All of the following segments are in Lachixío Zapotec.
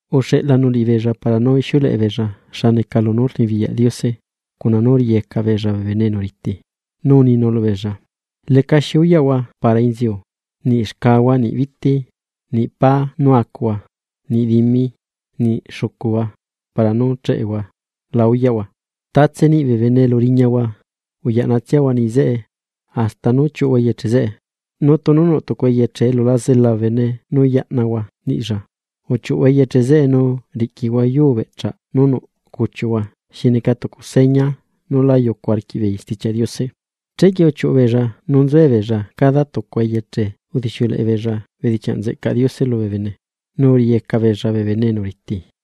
Uxeꞌlanu liꞌibeella para nú ixiuleꞌe beella xa neca lunú rnibiyaꞌ Diose, cuna nú riꞌiyeca beella bee bene enu riti. Nu uninu lubeella: ―Lecaxi uyaꞌhua para inziu, niꞌ xcahua niꞌ biti, niꞌ pá nu acuhua, niꞌ dimi, niꞌ xucuhua para nú cheꞌehua la uyaꞌhua. Tatse niꞌi bee bene elu riñahua, uyaꞌnatsiahua niꞌi zeꞌe, hasta nú chiuꞌuhua eyeche zeꞌe. Nu tunu nuꞌ tucu eyeche elu la zela bene nú yaꞌnahua niꞌlla, uchiuꞌuhua eyeche zeꞌe nu riꞌquihua yuu beꞌchaꞌ nú nuꞌ cuchiuꞌhua xi neca tucu seña nú lá yucu arquiꞌbeei Stichiaꞌ Diose. Chequie uchiuꞌu beella nu nzuebeella cada tucua eyeche udixiuleꞌe beella bedichiaꞌ nzeꞌcaꞌ Diose lubee bene, nu uriꞌiyeca beella bee bene enu riti.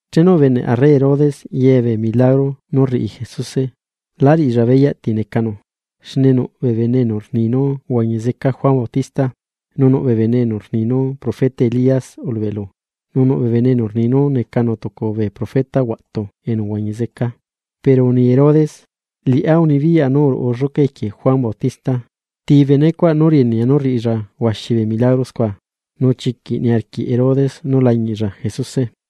Chenu ubeneꞌ arre Herodes ye bee milagro nú rriꞌi Jesuse, la riꞌilla beyaꞌ ti necanu. Xne nuꞌ bee bene enu rni nú uhuañi zeca Juan Bautista. Nu nuꞌ bee bene rni nú profeta Elías ulubeꞌlu. Nu nuꞌ bee bene rni nú necanu tucu bee profeta huaꞌtu enu uhuañi zeca. Pero uni Herodes: ―Liꞌá unibiyaꞌa nú uruꞌu lluca equie Juan Bautista. ¿Ti benecuaꞌ nú rienea nú rriꞌilla huaxi bee milagro scua? Nu chiquiꞌ niarquiꞌ Herodes nú lañiꞌlla Jesuse.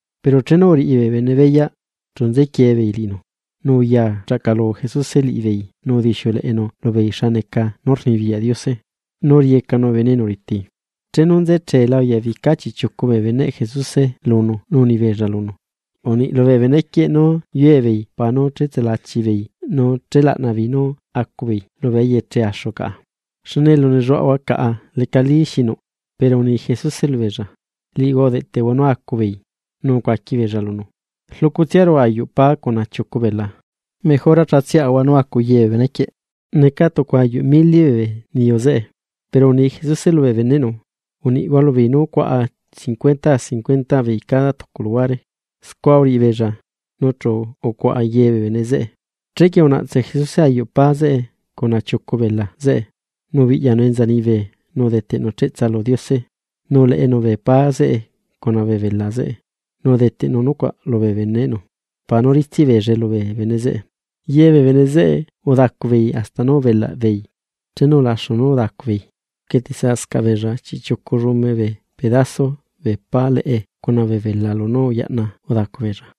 Pero chenu uriꞌi bee bene beyaꞌ, chu nzequie beei liꞌinu. Nu uya chaꞌcalu Jesuse liꞌibeei nu udixiuleꞌenu lubeei xa neca nú rnibiyaꞌ Diose, nu uriꞌiyecanu bee bene enu riti. Chenu nze cheela, uyabica chiꞌchiucu bee beneꞌ Jesuse lunu nu uni beella lunu: ―Uniꞌ lubee benequieꞌ nú yue beei para nú chetsulachi beei nu chélaꞌna beei nú acu beei lubee eyeche axu caꞌa, xne elu nelluaꞌahua caꞌa lecalí xinuꞌ. Pero uni Jesuse lubeella: ―Liꞌihua udeꞌtehua nú acubeei. Nu ucuaqui beella lunu: ―Rluꞌcutsiaru ayuꞌ pá cuna chiucu bela. Mejora chatsiaꞌahua nú acu ye bee benequieꞌ. Neca tucu ayuꞌ mili bee niyu zeꞌe. Pero uni Jesuse lubee beneꞌnu: ―Uniꞌhua lubeei nú cuaꞌa cincuentaa cincuentaa beei cada tucu luhuare. Scua uriꞌi beella, nu chu ucuaꞌa ye bee bene zeꞌe. Chequie unaꞌtse Jesuse ayuꞌ pá zeꞌe cuna chiucu bela zeꞌe, nu ubiꞌyanu enza liñibe nu udeteꞌnu cheꞌtsa lu Diose, nu uleꞌenu bee pá zeꞌe cuna bee bela zeꞌe nu udeteꞌnu nucuaꞌ lubee beneꞌnu para nú ritsiꞌ beellae lubee bene zeꞌe. Ye bee bene zeꞌe udacu beei hasta nú ubelaꞌ beei. Chenu ulaxu nú udacu beei, uquietesaꞌscaꞌ beella chiꞌchiucu llume bee pedaso bee pá leꞌe cuna bee bela lunú uyaꞌna udacu beella.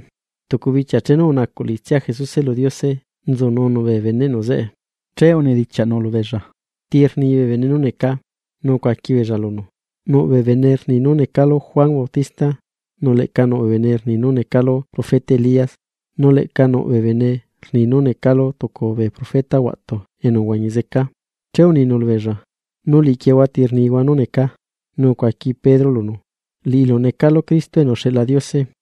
Tucu bichia chenu unacuꞌ liꞌitsia Jesuse lu Diose nzununu bee beneꞌnu zeꞌe. Che unidichiaꞌnu lubeella: ―¿Ti rni bee bene nú necaa? Nu ucuaqui beella lunu: ―Nuꞌ bee bene rni nú necalu Juan Bautista. Nu leꞌca nuꞌ bee bene rni nú necalu profeta Elías, nu leꞌca nuꞌ bee bene rni nú necalu tucu bee profeta huaꞌtu enu uhuañi zeca. Che uninu lubeella: ―¿Nu liꞌiquieehua ti rnihua nú necaa? Nu ucuaqui Pedro lunu: ―Liꞌilu necalu Cristo enu uxeꞌla Diose.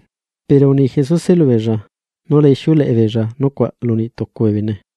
Pero uni Jesuse lubeella nú la ixiuleꞌe beella nucuaꞌ lu niꞌ tucu bee bene.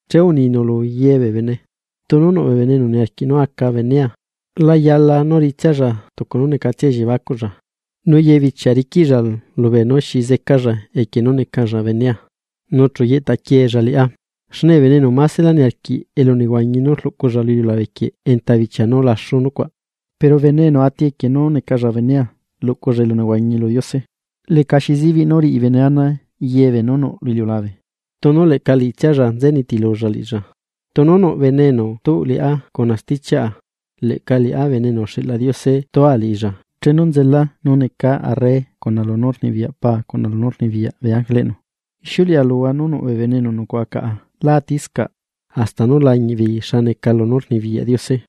Che uninu lu ye bee bene: ―Tunu nuꞌ bee bene enu niarquiꞌ nú aca benea, la yala nú riꞌitsialla tucu nú necatsia elliebacuꞌlla. Nu ye bichia riquiꞌlla lubee nú xi zecalla equie nú necalla benea, nu chu yeꞌta quieella liꞌá. Xne bee bene enu másela niarquiꞌ huañi lu iliulabe quieꞌ enta bichia nú laxu nucuaꞌ. Pero bene enu ati equie nú necalla benea, luꞌculla elunehuañi lu Diose. Lecaxi zibiꞌ nú riꞌi bene ana ye beenú nuꞌ lu iliulabe, tunu leꞌca liꞌitsialla nze nitilulla liꞌilla. Tunu nuꞌ bene enu tuꞌ liꞌá cuna stichiaꞌa, leꞌca liꞌá Bene enu uxeꞌla Diose tua liꞌilla chenu nzela nú necaa arre cuna lunú rnibiyaꞌ paa cuna lunú rnibiyaꞌ bee ángeleꞌnu. Ixiuleꞌa luhua nu nuꞌ bee bene enu nucuaꞌa caꞌa lá atiscaꞌ, hasta nú lañiꞌ beei xa neca lunú rnibiyaꞌ Diose.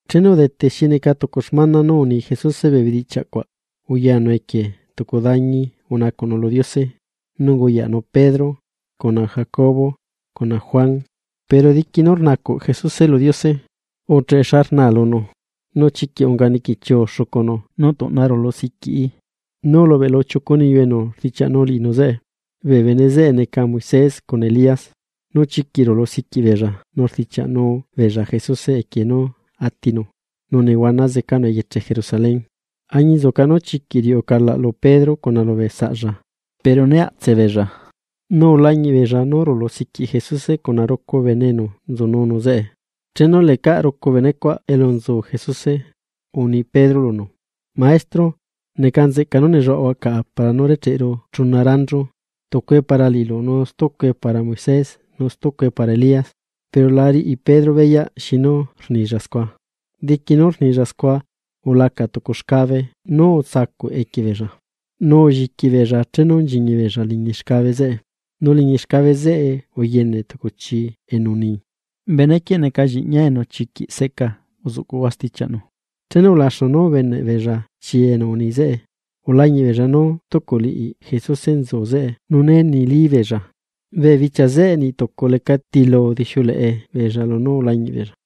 Chenu udete xi neca tucu xmana nú uni Jesuse bee bedichiaꞌ cuaꞌ, uyanu equie tucu dañi unacuꞌnu lu Diose, nu unguyaꞌnu Pedro, cuna Jacobo, cuna Juan. Pero diqui nú rnacuꞌ Jesuse lu Diose ucheꞌe xa rnaa lunu, nu chiquiꞌ unga niquichiu xucunu nu tuꞌna rulu siquiꞌi. Nu ulubeꞌlu chiucu niyu enu rdichiaꞌnu liꞌinu zeꞌe. Bee bene zeꞌe neca Moisés cuna Elías. Nu chiquiꞌ rulu siquiꞌ beella nu rdichiaꞌnu beella Jesuse equie nú atinu nu nehuana zecanu eyeche Jerusalén. Añinzuca nú chiquiꞌ riuꞌu calaꞌ lu Pedro cuna lubee saꞌlla, pero né aꞌtse beella, nu ulañiꞌ beella nú rulu siquiꞌ Jesuse cuna rucu bene enu nzununu zeꞌe. Chenu lecaꞌ rucu benecuaꞌ elu nzu Jesuse, uni Pedro lunu: ―Maestro, ¡neca nzeꞌca nú nelluaꞌahua caꞌa para nú recheꞌru chuna ranchu, tucue para liꞌilu nu stucue para Moisés, nu stucue para Elías! Pero la riꞌi Pedro beyaꞌ xinu rnilla scua. Diqui nú rnilla scua, ulaca tucu xcabe nú utsacuꞌ equie beella, nu ulliqui beella chenu nchiñi beella liñi xcabe zeꞌe. Nu liñi xcabe zeꞌe uyene tucu chii enu uni: ―Benequieꞌ neca Lliꞌñia enu chiquiꞌ seꞌca, uzuꞌcuꞌhua stichiaꞌnu. Chenu ulaxu nú ubeneꞌ beella chi enu uni zeꞌe, ulañiꞌ beella nú stucu liꞌi Jesuse nzunu zeꞌe nu né nilí beella. Bee bichia zeꞌe niꞌ tucu leca tilu udixiuleꞌe beella lunú ulañiꞌ beella.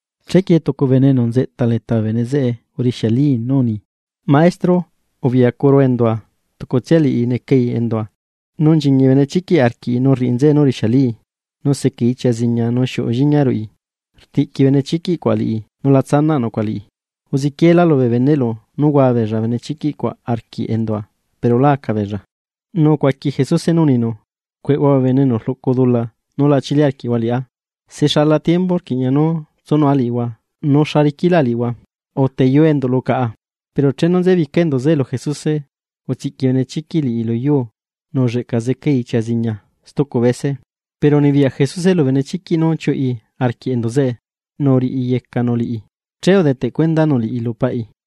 Chequie tucu bene enu nzeꞌta leta bee bene zeꞌe urixialii nú uni: ―Maestro, ubiꞌyacuru endua, tucutsia liꞌi necai endua. Nu nchiñi benechiquiꞌ arquiꞌi nu rriꞌi nzeꞌe nú rixialii, nu secai ichia ziña nu xiuꞌu lliña ruꞌi, rtiꞌqui benechiquiꞌ cuaꞌ liꞌi nu la tsanaꞌ nucuaꞌ liꞌi. Uzequieelá lubee beneꞌlu nú hua beella benechiquiꞌ cuaꞌ arquiꞌ endua, pero lá aca beella. Nu ucuaqui Jesuse nú uninu: ―¡Cueꞌhua bee bene enu rluꞌcu dula nú la chili arquiꞌhua liꞌá! ¿Se xala tiembu rquiꞌña nú tsunua liꞌihua nu xa riquilá liꞌihua? Uteyuu enduꞌlu caꞌa. Pero chenu nzebica enduꞌ zeꞌe lu Jesuse, utsiꞌqui benechiquiꞌ liꞌi lu yuu nu ulleꞌca zecai ichia ziña stucu bese, pero unibiyaꞌ Jesuse lu benechiquiꞌ nú chiuꞌi arquiꞌ enduꞌ zeꞌe nu uriꞌiyecanu liꞌi, che udeteꞌ cuendanu liꞌi lu paꞌi.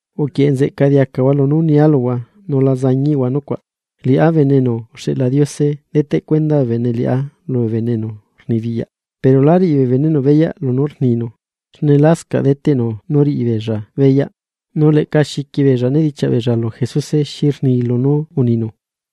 ―Uquieꞌe nzeꞌca diacahua lunú nia luhua nu la zañiꞌhua nucuaꞌ. Liꞌá Bene enu uxeꞌla Diose deteꞌ cuenda bee bene liꞌá lubee bene enu rnibiyaꞌ. Pero lá riꞌi bee beneꞌnu beyaꞌ lunú rninu, xne lascaꞌ deteꞌnu nú rriꞌi beella beyaꞌ, nu leꞌca xiqui beella nedichiaꞌ beella lu Jesuse xi rni lunú uninu.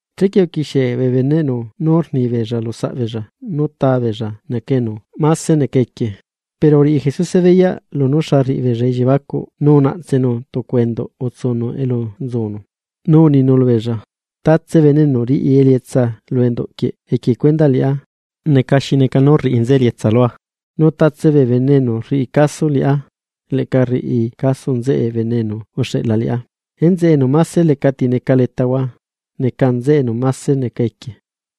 Chequie uquixie bee beneꞌnu nú rni beella lusaꞌbeella nú tá beella neca enu máse neca equie. Pero uriꞌi Jesuse beyaꞌ lunú xa rriꞌi beella elliebacuꞌ nu unaꞌtsenu tucu enduꞌ utsunu elu nzunu, nu uninu lubeella: ―Tatse bene enu riꞌi elietsa lu enduꞌ quieꞌ equie cuendaꞌ liꞌá, neca xi neca nú rriꞌi nzeꞌe elietsa lua, nu tatse bee bene enu rriꞌi caso liꞌá, leꞌca rriꞌi caso nzeꞌe bene enu uxeꞌla liꞌá. Enzeꞌe enu máse lecati neca letahua, neca nzeꞌe enu máse neca equie.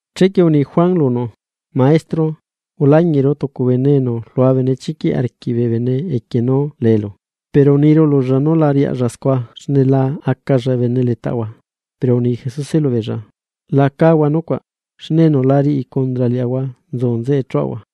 Chequie uni Juan lunu: ―Maestro, ulañiꞌru tucu bene enu rlua benechiquiꞌ arquiꞌ bee bene equie nú leelu, pero uniru lulla nu la riaꞌlla scua xne la acalla bene letaꞌahua. Pero uni Jesuse lubeella: ―La cáhua nucuaꞌ, xne enu la riꞌi condra liaꞌahua nzu nzeꞌe chuꞌahua.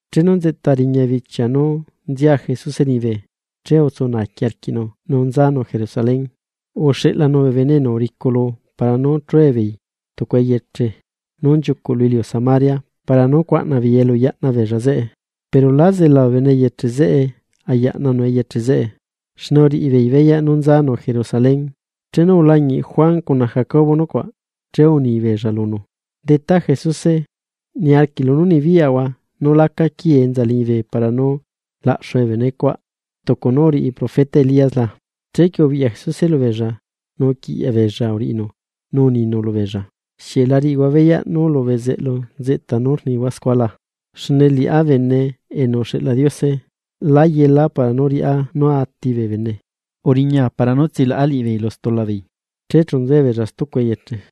Chenu nzeꞌta riña bichia nú nzia Jesuse liñibe, che utsu naaqui arquiꞌnu nu nzanu Jerusalén. Uxeꞌlanu bee bene enu uriculu para nú chue beei tucu eyeche nú nchiucuꞌ lu iliu Samaria para nú cuaꞌna beei elu yaꞌna beella zeꞌe. Pero lá zela bee bene eyeche zeꞌe ayaꞌnanu eyeche zeꞌe, xne uriꞌi beei beyaꞌ nú nzanu Jerusalén. Chenu ulañiꞌ Juan cuna Jacobo nucuaꞌ, che uni beella lunu: ―Detá Jesuse, ¿niarquiꞌlu nú nibiyaꞌahua nú laca quii enza liñibe para nú laꞌxue bee bene cuaꞌ tucu nú uriꞌi profeta Elías la? Chequie ubiꞌya Jesuse lubeella, nu uquiꞌyaꞌ beella uriꞌinu nú uninu lubeella: ―¿Xieꞌ la riꞌihua beyaꞌ nú lu bezeꞌlu nzeꞌta nú rnihua scua la? Xne liꞌá Bene enu uxeꞌla Diose, lá yela para nú riꞌá nú ati bee bene, nzela para nú tsilaꞌa liꞌibeei lu dula. Che chu nzuebeella stucu eyeche.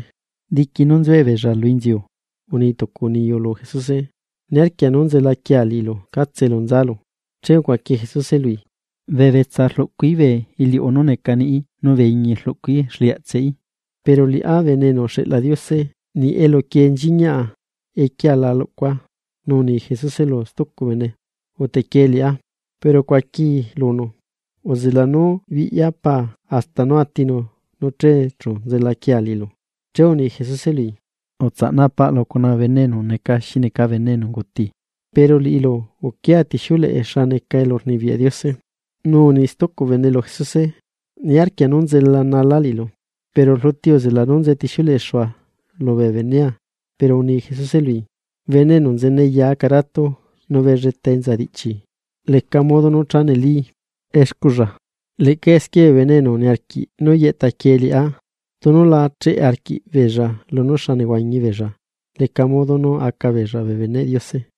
Diqui nu nzuebeella inziu, uni tucu niyu lu Jesuse: ―Niarquia nu nzela quiea liꞌilu catse elu nzalu. Che ucuaqui Jesuse lui: ―Bee betsa rluꞌcuí bee iliuꞌu nú neca niꞌí nu bee iñi rluꞌcuí exliaꞌtseꞌí, pero liꞌá Bene enu uxeꞌla Diose niꞌ elu quiee nchiñaꞌ equiea la lucua. Nu uni Jesuse lu stucu bene: ―Utequiee liꞌá. Pero ucuaquii lunu: ―Uzela nú biꞌya paa hasta nú atinu nu che chu nzela quiea liꞌilu. Che uni Jesuse lui: ―Utsaꞌna paꞌlu cuna bee bene enu neca xi neca bene enu unguti, pero liꞌilu uquia tixiuleꞌe xa neca elurnibiyaꞌ Diose. Nu uni stucu bene lu Jesuse: ―Niarquia nú nzelanala liꞌilu, pero rluti uzela nú nze tixiuleꞌexua lubee benea. Pero uni Jesuse lui: ―Bene enu nzene ya acaratu nu belletalla enza diꞌchilla, leca modo nú cha neli excuꞌlla. Leꞌca esquie bee bene enu niarquiꞌ nú yeꞌta quiee liꞌá, tunu la cheꞌe arquiꞌbeella lunú xa nehuañi beella, leca modo nú aca beella bee beneꞌ Diose.